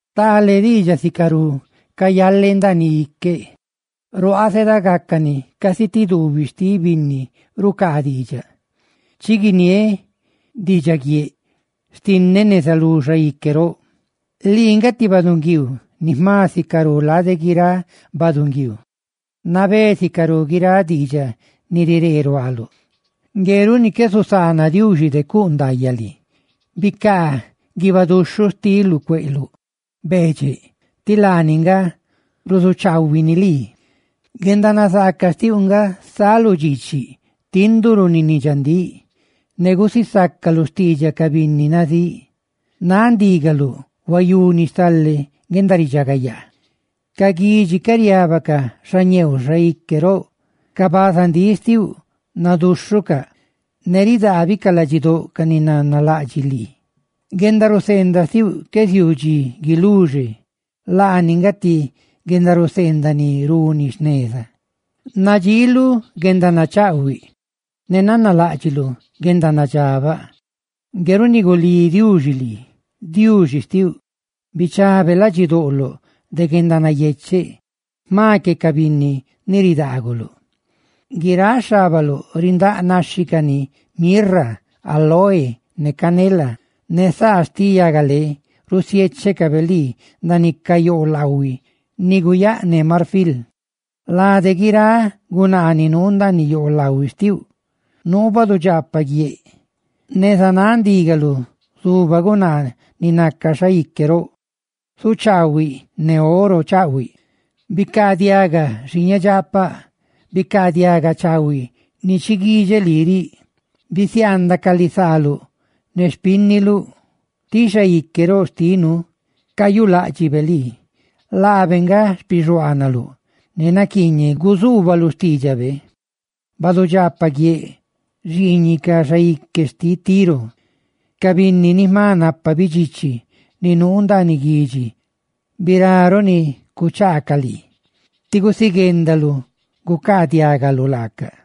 Stale diidxaꞌ sicarú cayale ndaaniꞌ iqueꞌ; ruaaꞌ, zedagacani casi ti duubiꞌ xtiꞌ binni rucaa diidxaꞌ. ¡Chi guiniéꞌ diidxaguieꞌ xtinneꞌ neza lú xaique roꞌ! ¡Lii nga ti baꞌdunguiiu ni jma sicarú lade guiráꞌ baꞌdunguiiu! ¡Nabé sicarú guiráꞌ diidxaꞌ ni riree ruaaluꞌ! Ngue runi qué zusaana Diuxi de cuꞌ ndaayaꞌ lii. ¡Bicaa guiibaꞌ duxhuꞌ xtiluꞌ cueꞌluꞌ, beedxeꞌ! ¡Ti laani nga ruzuchaahuini lii! Guendanazaaca xtiuꞌ nga saluꞌ dxiichiꞌ, tinduꞌ runi ni dxandíꞌ, ne gusisácaluꞌ xtiidxaꞌ ca binni nazíꞌ. ¡Náꞌ ndígaluꞌ huayuni stale guendaridxagayaa! Ca guidxi ca riábacaꞌ xañeeuꞌ xaique roꞌ; ca bazandíꞌ xtiuꞌ naduxhucaꞌ ne ridaabicaꞌ ladxidóꞌ ca ni nanalaꞌdxiꞌ lii. Ay Diuxi, guendaraca ni naluꞌ, que ziuu dxi guiluxe, laani nga ti guendanandxóꞌ ni runi jneza. Nadxiiluꞌ guendanachaꞌhuiꞌ ne nanaláꞌdxiluꞌ guendanadxabaꞌ. Ngue runi gulí Diuxi lii, Diuxi xtiuꞌ, bichabe ladxidoꞌloꞌ de guendanayecheꞌ jma que ca binni ni ridaaguluꞌ. Guiráꞌ xhábaluꞌ rindáꞌ naxhi cani mirra, áloe ne canela; ne saa xtiꞌ yagalé rusiéchecabe lii ndaaniꞌ ca yoolaꞌhuiꞌ ni guyaꞌné marfil. Lade guiráꞌ gunaa ni nuu ndaaniꞌ yoolaꞌhuiꞌ xtiuꞌ nuu badudxaapaꞌ guiéꞌ; neza náꞌ ndígaluꞌ zuba gunaa ni naca xaique roꞌ, zuchaahuiné oro chaꞌhuiꞌ. Bicaadiaga, xiiñedxaapaꞌ; bicaadiaga chaahuiꞌ ni chi guidxe lii riꞌ: Bisiaandaꞌ ca lisaaluꞌ ne xpínniluꞌ, tí xaique roꞌ xtinu cayuláꞌdxibe lii; laabe nga xpixuaanaluꞌ ne naquiiñeꞌ guzuubaluꞌ xtiidxabe. Badudxaapaꞌ guiéꞌ xiiñiꞌ ca xaique xtiꞌ Tiro, ca binni ni jma napa bidxichi ni nuu ndaaniꞌ guidxi, birá ruꞌ ni cuchaacaꞌ lii ti gusiguendaluꞌ gucaadiaꞌguꞌ laacaꞌ.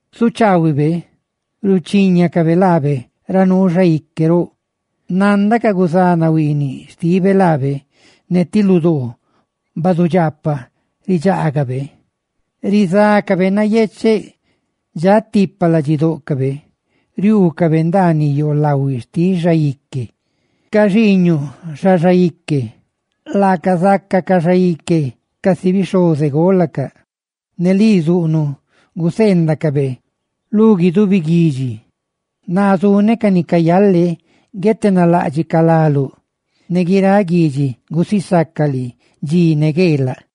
Zuchaahuibe ruchíñacabe laabe ra nuu xaique roꞌ, nanda ca guzanahuiiniꞌa xtibe laabe, ne ti ludoo badudxaapaꞌ ridxaagabe. Rizácabe nayecheꞌ; dxaꞌ tipa ladxidóꞌcabe riuucabe ndaaniꞌ yoolaꞌhuiꞌ xtiꞌ xaique. Ca xiiñuꞌ, xa xaique, laaca zácacaꞌ xaique casi ca bixhozegolaluꞌ, ne lii zuꞌnuꞌ gacaꞌ ni nácabe lu guidubi guidxi. Naa zuneꞌ ca ni cayalé ruꞌ guietenaláꞌdxicaꞌ láluꞌ, ne guiráꞌ guidxi gusisaca lii dxi ne gueelaꞌ.